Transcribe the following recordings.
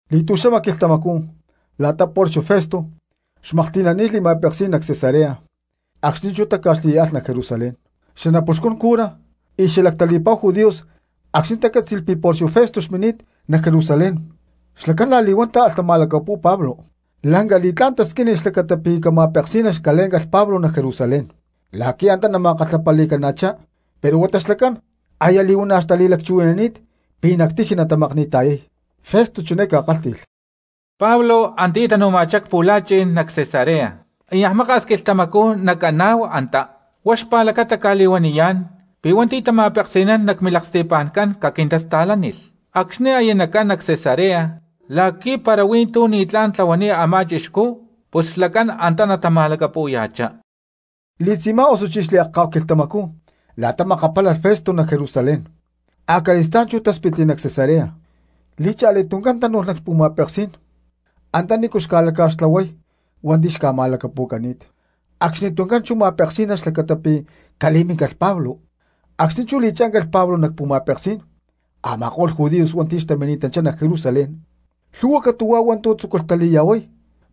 Li̠tu̠xama quilhtamacú la̠ta Porcio Festo xmaklhti̠nani̠t xli̠ma̠peksí̠n nac Cesarea acxni̠ chú táca̠xli y alh nac Jerusalén. Xanapuxcun cura, lakko̠lutzi̠nni ma̠peksi̠naní̠n y xalactali̠pa̠hu judíos acxni̠ tacátzi̠lh pi̠ Porcio Festo xmini̠t nac Jerusalén, xlacán la̠li̠huán táalh tama̠lacapu̠y Pablo. Lanca li̠tlá̠n tasquínilh xlacata pi̠ cama̠peksí̠nalh calé̠ncalh Pablo nac Jerusalén la̠qui̠ antá nama̠kalhapali̠cana̠chá, pero huata xlacán aya li̠huana̠ xtali̠lacchuhui̠nani̠t pi̠ nac tiji natamakni̠ta̠yay. Festo chiné ca̠kálhti̠lh: —Pablo antiyá tanu̠ma̠chá cpu̠la̠chi̠n nac Cesarea y niaj maka̠s quilhtamacú nacaná antá. Huá xpa̠lacata cca̠li̠huaniyá̠n pi̠ hua̠nti̠ tama̠peksi̠nán nac milaksti̠pa̠ncán caquintasta̠lánilh acxni̠ aya nacán nac Cesarea la̠qui̠ para huí tu̠ ni̠tlá̠n tlahuani̠t a̠má chixcú pus xlacán antá natama̠lacapu̠ya̠chá. Xli̠tzi̠má osuchí xliakcá̠hu quilhtamacú la̠ta makapálalh Festo nac Jerusalén, acali̠stá̠n chú táspitli nac Cesarea. Li̠cha̠li tuncán chú tánu̠lh nac xpu̠ma̠peksí̠n antanícu xca̠laca̠xtlahuay hua̠nti̠ xca̠ma̠lacapu̠cani̠t, acxnituncán chú a̠má ma̠peksí̠nalh xlacata pi̠ cali̠minícalh Pablo. Acxni̠ chú li̠chíncalh Pablo nac pu̠ma̠peksí̠n a̠ma̠ko̠lh judíos hua̠nti̠ xtamini̠tanchá nac Jerusalén lhu̠hua catu̠huá hua̠ntu̠ tzúculh tali̠ya̠huay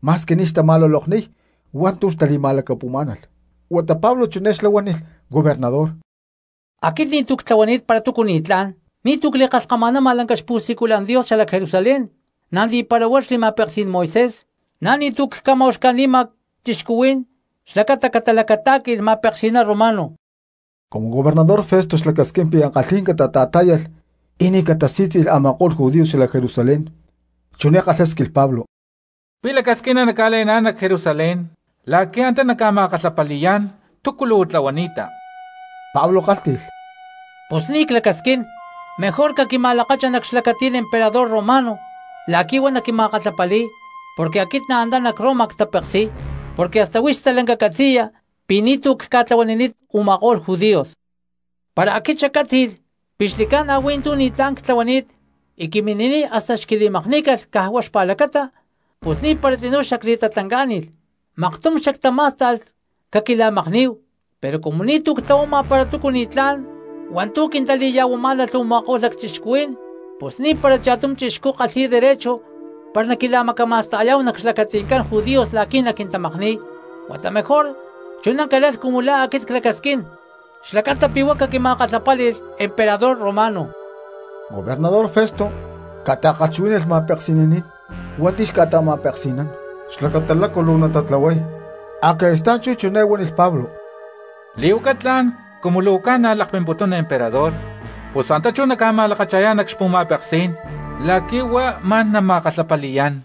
ma̠squi ni̠ xtama̠lulokniy hua̠ntu̠ xtali̠ma̠lacapu̠má̠nalh. Huata Pablo chiné xlá huánilh gobernador: —Aquit ni̠tu̠ ctlahuani̠t para túcu ni̠tlá̠n, ni̠tu̠ cli̠kalhkama̠nama lanca xpu̠siculan Dios xalac Jerusalén, na̠ ni̠para huá xli̠ma̠peksí̠n Moisés, na̠ ni̠tu̠ cca̠ma̠uxca̠ni̠ma cristianos xlacata catata̠la̠lacatá̠qui̠lh ma̠peksi̠ná romano. Cumu gobernador Festo xlacasquín pi̠ ankalhí̠n catata̠tá̠yalh y ni̠ catasí̠tzi̠lh a̠ma̠ko̠lh judíos xalac Jerusalén chiné kalhásquilh Pablo: —¿Pi̠ lacasquina nacca̠le̠ná̠n nac Jerusalén la̠qui̠ antá nacca̠ma̠kalhapali̠yá̠n túcu luu tlahuani̠ta? Pablo kálhti̠lh: —¡Pus ni̠ clacasquín! Mejor caquima̠lakacha nac xlacatí̠n emperador romano la̠qui̠ huá naquima̠kalhapali̠y, porque aquit na̠ antá nac Roma ctapeksi̠y. Porque hasta huix stalanca catzi̠ya pi̠ ni̠tu̠ cca̠tlahuanini̠t u̠ma̠ko̠lh judíos. Para aquit xaccátzi̠lh pi̠ xli̠ca̠na hui̠ntú ni̠tlá̠n ctlahuani̠t y quimini̠niy hasta xquili̠makní̠calh caj huá xlacata, pus ni̠para tzinú xactatlancá̠ni̠lh maktum xactamá̠sta̠lh caquila̠makní̠hu, pero cumu ni̠tu̠ ctlahuama para túcu ni̠tlá̠n hua̠ntu̠ quintali̠ya̠huamá̠nalh u̠ma̠ko̠lh lacchixcuhuí̠n pus ni̠para cha̠tum chixcú kalhi̠y derecho para naquila̠macama̠sta̠yá̠hu nac xlacati̠ncán judíos la̠qui̠ naquintamakni̠y. Huata mejor chuná calalh cumu la̠ aquit clacasquín xlacata pi̠ huá caquima̠kalhapáli̠lh emperador romano. Gobernador Festo ca̠ta̠kalhchuhuí̠nalh makapitzí̠n hua̠nti̠ xca̠ta̠ma̠peksi̠nán xlacata lácu luu natatlahuay, acali̠stá̠n chú chiné huánilh Pablo: —Li̠huaca tla̠n, cumu luu ca̠na̠ lakpimputuna emperador, pus antá chú nacma̠lakacha̠yá̠n nac xpu̠ma̠peksí̠n la̠qui̠ huá ma̠n nama̠kalhapali̠yá̠n.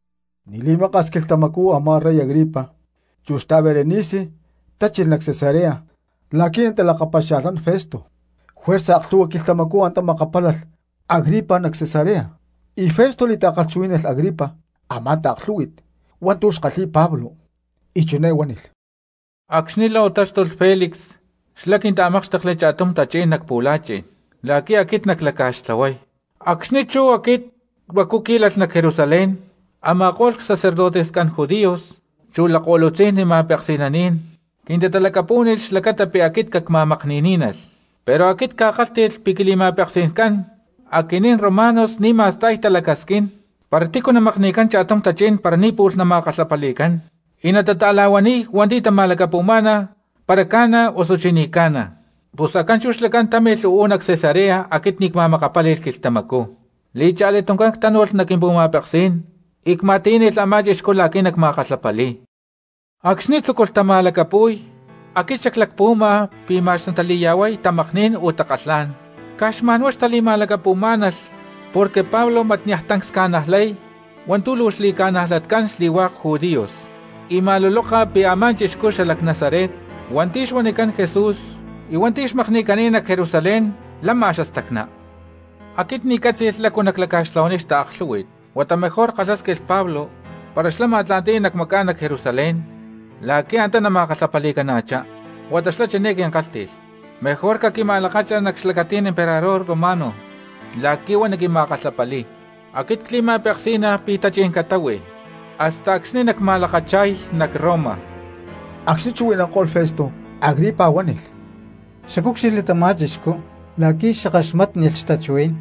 Ni̠ li̠maka̠s quilhtamacú a̠má rey Agripa chu xta̠Berenice tachilh nac Cesarea la̠qui̠ natalakapaxia̠lhnán Festo. Juerza aklhu̠hua quilhtamacú antá makapálalh Agripa nac Cesarea, y maktum Festo li̠ta̠chuhuí̠nalh Agripa a̠má taaklhú̠hui̠t hua̠ntu̠ xkalhi̠y Pablo, y chiné huánilh: —Acxni̠ la̠ u̠táxtulh Felix xlá quinta̠mákxtekli cha̠tum tachí̠n nac pu̠la̠chi̠n la̠qui̠ aquit naclaca̠xtlahuay tu̠ li̠n. Acxni̠ chú aquit huacu cquí̠lalh nac Jerusalén a̠ma̠ko̠lh xanapuxcún xcurajcán judíos chu lakko̠lutzi̠nni xma̠peksi̠nacán quintalacapú̠nilh xlacata pi̠ aquit cacma̠makni̠ní̠nalh. Pero aquit cca̠kálhti̠lh pi̠ quili̠ma̠peksi̠ncán aquinín romanos ni̠ ma̠sta̠y talacasquín para tícu namakni̠cán cha̠tum tachí̠n para ni̠ pu̠lh nama̠kalhapali̠cán y natata̠la̠huaniy hua̠nti̠ tama̠lacapu̠má̠nalh para ca̠na osuchí ni̠ ca̠na. Pus acxni̠ chú xlacán támilh uú nac Cesarea aquit ni̠ cma̠makapáli̠lh quilhtamacú li̠cha̠li tuncán ctánu̠lh nac quimpu̠ma̠peksí̠n y cma̠tiyá̠nalh a̠má chixcú la̠qui̠ nacma̠kalhapali̠y. Acxni̠ tzúculh tama̠lacapu̠y aquit xaclacpuhuama pi̠ ma̠x natali̠ya̠huay tamakní̠n o takalhá̠n. Caj xma̠nhuá xtali̠ma̠lacapu̠má̠nalh porque Pablo mat niaj tancs ca̠najlay hua̠ntu̠ luu xli̠ca̠najlatcán xli̠hua̠k judíos y ma̠luloka pi̠ a̠má chixcú xalac Nazaret hua̠nti̠ xuanicán Jesús y hua̠nti̠ xmakni̠cani̠t nac Jerusalén lama xastacná. Aquit ni̠ ccátzi̠lh lácu naclaca̠xtlahuay xtaaklhú̠hui̠t, huata mejor ckalhásquilh Pablo para xlá xma̠tla̠nti̠y nacmacá̠n nac Jerusalén la̠qui̠ antá nama̠kalhapali̠cana̠chá. Huata xlá chiné quinkálhti̠lh: “Mejor caquima̠lakacha nac xlacatí̠n emperador romano la̠qui̠ huá naquima̠kalhapali̠y.” Aquit cli̠ma̠peksí̠nalh pi̠ tachí̠n catáhui hasta acxni̠ nacma̠lakacha̠y nac Roma. Acxni̠ chuhui̠nanko̠lh Festo, Agripa chiné huánilh: —Xacúcxilhli tamá chixcú la̠qui̠ xackaxmátnilh xtachuhuí̠n.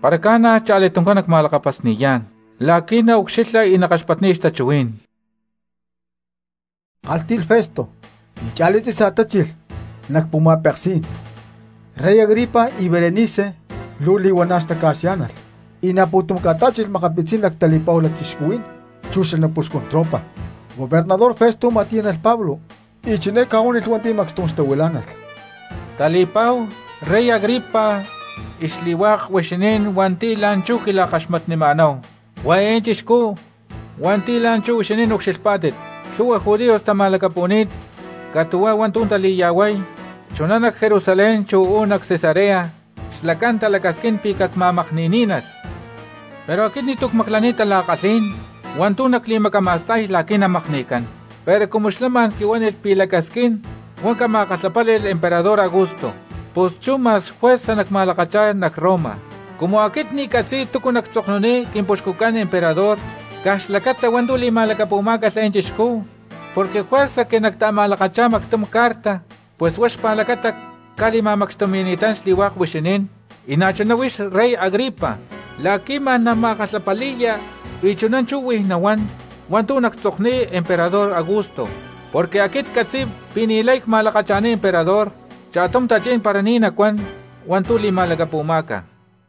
—Para ca̠na, cha̠li tuncán nacma̠lakapasni̠yá̠n la̠qui̠ naucxilha y nakaxpatniya xtachuhuí̠n —kálhti̠lh Festo. Li̠cha̠li tzi̠sa tachilh nac pu̠ma̠peksí̠n rey Agripa y Berenice luu li̠huana̠ xtaca̠xyá̠nalh, y na̠ pu̠tum ca̠tá̠chilh makapitzí̠n lactali̠pa̠hu lacchixcuhuí̠n chu xanapuxcun tropa. Gobernador Festo ma̠tiyá̠nalh Pablo, y chiné ca̠huánilh hua̠nti̠ macxtum xtahuilá̠nalh: —Tali̠pa̠hu rey Agripa y xli̠hua̠k huixinín hua̠nti̠ la̠nchú quila̠kaxmatnima̠náhu, huá eé chixcú hua̠nti̠ la̠nchú huixinín ucxilhpá̠tit, lhu̠hua judíos tama̠lacapu̠ni̠t, catu̠huá hua̠ntu̠ tali̠ya̠huay chuná nac Jerusalén chu uú nac Cesarea. Xlacán talacasquín pi̠ cacma̠makni̠ní̠nalh, pero aquit ni̠tu̠ cmaclaniy tala̠kalhí̠n hua̠ntu̠ nacli̠macama̠sta̠y la̠qui̠ namakni̠cán. Pero cumu xlá ma̠n quihuánilh pi̠ lacasquín huá cama̠kalhapáli̠lh emperador Augusto pus chú ma̠x juerza nacma̠lakacha̠y nac Roma. Cumu aquit ni̠ ccatzi̠y túcu nactzokniy quimpuxcucán emperador caj xlacata hua̠ntu̠ li̠ma̠lacapu̠má̠calh eé chixcú, porque juerza que nacta̠ma̠lakacha̠y mactum carta, pus huá xpa̠lacata cca̠li̠ma̠macxtumi̠ni̠tán xli̠hua̠k huixinín y na̠chuná huix rey Agripa la̠qui̠ ma̠n nama̠kalhapali̠ya y chuná chú huij nahuán hua̠ntu̠ nactzokniy emperador Augusto. Porque aquit ccatzi̠y pi̠ ni̠lay cma̠lakacha̠niy emperador cha̠tum tachí̠n para ni̠ nacuán hua̠ntu̠ li̠ma̠lacapu̠má̠calh.